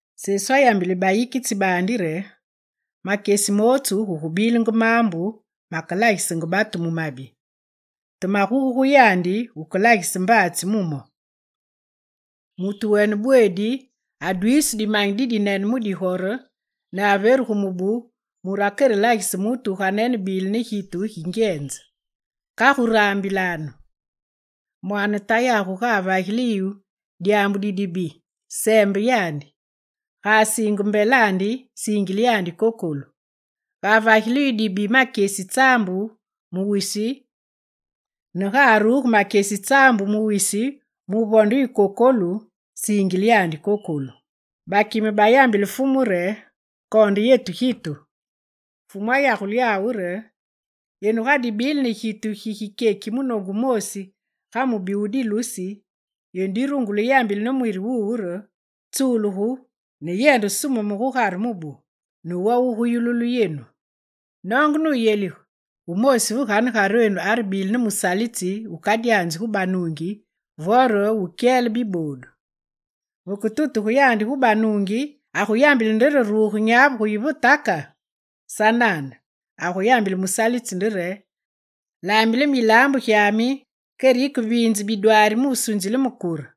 Sesu ayambile bayikitsi baandi re: «Makyesi mootsu gugubilenge maambu makelagisenge batu mu mabi. Te maguge gu yandi wukelagise mbaatsi mu mo. Mutu wene bweedi adwiisu dimanyi didinene mu digore, nuveru gu mubu mure akerelagise mutu wuganene bile ne gitu gingyenze. Kagu raambilanu! Mwaane tayagu ga avagile yu dyaambu didibi, seembe yandi. Ga asiinge mbelandi, siingile yandi kokolu. Ga avagile yu dibi makyesi tsaambu mu wisi ne ga aruge makyesi tsaambu mu wisi muvonde yu kokolu, yisiingile yandi kokolu.» Bakime bayambile Fumu re: «Koonde yetu gitu.» Fumu ayagule yawu re: «Yenu ga dibile ne gitu gigikyeki munoongu wumoosi ga mubi wu dilusi, yenu digurungule yambile ne mwiri wuwu re: “Tsulugu ne yende sumeme gugare mubu”, ne wo wuguyululu yenu. Noonge nuyelige: wumoosi ve ganegarenu arebile ne musalitsi wukadyanzi gu banuungi vore wukakyeli biboodu. Veketutugu yandi gu banuungi, aguyambile nde re ruge nyavu muyi ve taka? Sanane, aguyambile musalitsi nde re: “Laambile me yilaambu gyami, kere yikeviinze bidwaari mu sunzile me kure.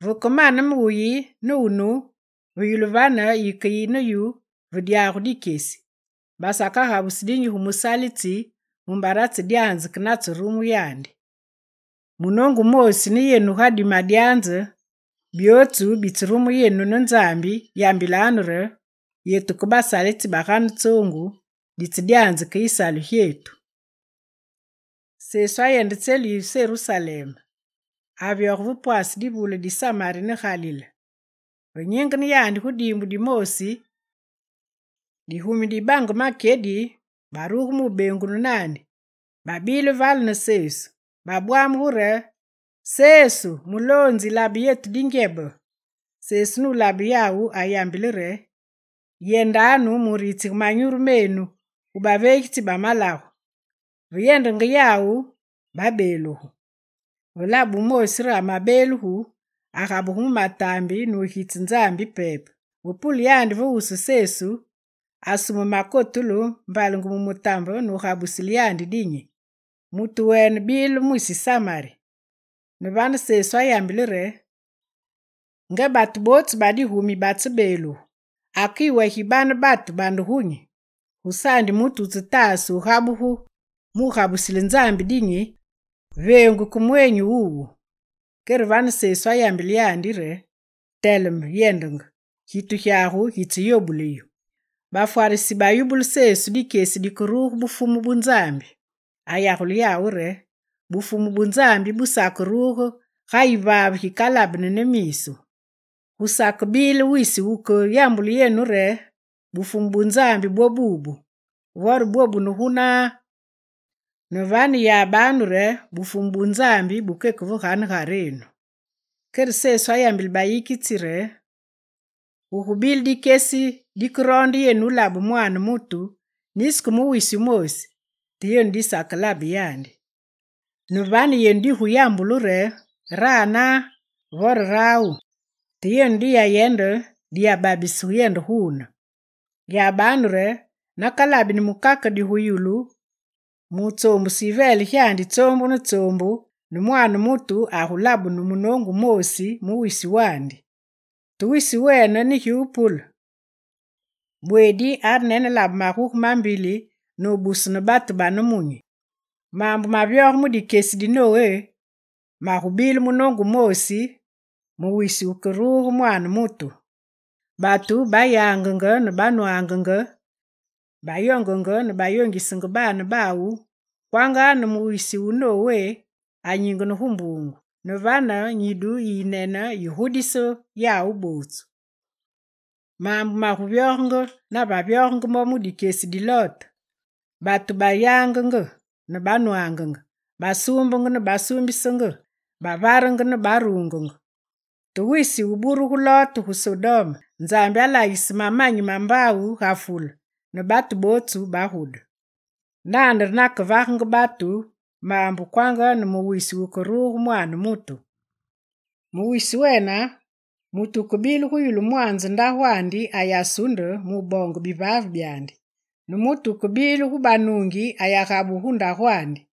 Vekemane me wuyi ne wunu, ve yulu vane, yikeyi ne wunu ve dyagu dikyesi.” Basakagabusi dinyi gu musalitsi mumbare atsedyanze ke natserumu yandi. Munoongu wumoosi ne yenu ga dimadyanze byootsu bitserumu yenu ne Nzambi, yambilanu re: “Yetu ke basalitsi bagane tsoongu ditsedyanze ke yisalu gyetu.”» Sesu ayende tselu yi Serusalem. Avyoge ve pwase divule di Samari ne Galilé. Ve nyingene yandi gu diimbu dimoosi, digumi di batu bange makyedi baruge mu beengunu naandi. Babile vale ne Sesu. Babwamugu re: «Sesu, Muloonzi, labe yetu dingyebe!» Sesu nulabe yawu, ayambile re: «Yendanu muritsige manyuru menu gu baveegitsi ba malagu.» Ve yendenge yawu, babeelugu. Ve labe wumoosi re amebeelugu, agabugu mu mataambi nugitse Nzambi pepe. Ve pule yandi ve wusu Sesu, asume makotulu, mbalenge mu mutambe nugabusile yandi dinyi. Mutu wene bile mwisi Samari. Ne vane, Sesu ayambile re: «Nga batu bootsu ba digumi batsebeelugu, ake yiwe gi bane batu bande gunyi? Gusaandi mutu wutsetaase wugabugu mu gabusile Nzambi dinyi, veengu ke mweenyi wuwu.» Kere vane Sesu ayambile yandi re: «Teleme, yendenge, gitu gyagu gitseyobule yu.» Bafwarisi bayubule Sesu dikyesi dikeruge Bufumu bu Nzambi. Ayagule yawu re: «Bufumu bu Nzambi busakeruge ga yivaave gikalabeni ne miisu. Gusakebile wisi wuke yambulu yenu re: “Bufumu bu Nzambi bwobu.” Vore: “Bwobune gunaa.” Ne vane yabanu re Bufumu bu Nzambi bukeke ve ganegarenu.» Kere Sesu ayambile bayikitsi re: «Gugubile dikyesi dikeroonde yenu wulabe Mwaane mutu nisi ke wisi wumoosi, te yenu disakelabe yandi. Ne vane, yenu diguyambulu re: “Ranaa, vore rawu!” Te yenu diyayende, diyababise yende guune. Yabanu re nakalabeni mukakedi gu yulu mu wutsoombuse yiveele gyandi tsoombu ne tsoombu, ne Mwaane mutu agulabunu munoongu wumoosi mu wisi wandi. Te wisi wene ne gi wupule, bweedi arenelabe maguge mambili nubusu ne batu ba nemunyi. Maambu mavyoge mu dikyesi di Nowé magubile munoongu wumoosi mu wisi wukeruge Mwaane mutu. Batu bayangenge ne banwangenge, bayoongenenge ne bayoongisenge baane bawu, kwanga ne mu wisi wu Nowé anyingene gu mbuungu; ne vane, nyidu yiyinene yigudise yawu bootsu. Maambu maguvyogenge ga navyogenge mo mu dikyesi di Lote. Batu bayangenge ne banwangenge, basuumbenge ne basuumbisenge, bavarenge ne baruungenge. Te wisi wuburugu Lote gu Sodome, Nzambi alaagise mamanyi ma mbaawu ga fule, ne batu bootsu bagude. Nane re nakevagenge batu maambu kwanga ne mu wisi wukeruge Mwaane mutu. Mu wisi wene, mutu wukebile gu yulu mwaanze ndagwandi ayasunde muboonge bivaave byandi, ne mutu wukebile gu banuungi ayagabugu gu ndagwandi.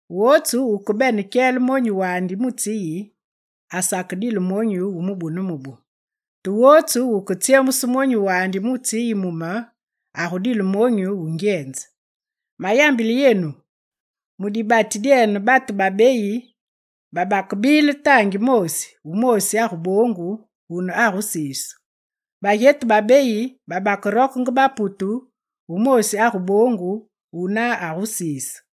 Wotsu wukebene kyele monyu wandi mu tsi yi, asakedile monyu wu mubu ne mubu. Te wotsu wuketsyemuse monyu wandi mu tsi yi mu me, agudile monyu wu ngyenze. Mayambile yenu, mu dibati dyene, batu babeyi babakebile taangi moosi. Wumoosi aguboongu, wune agusiisu. Bagyetu babeyi bagurokenge baputu. Wumoosi aguboongu, wuna agusiisu.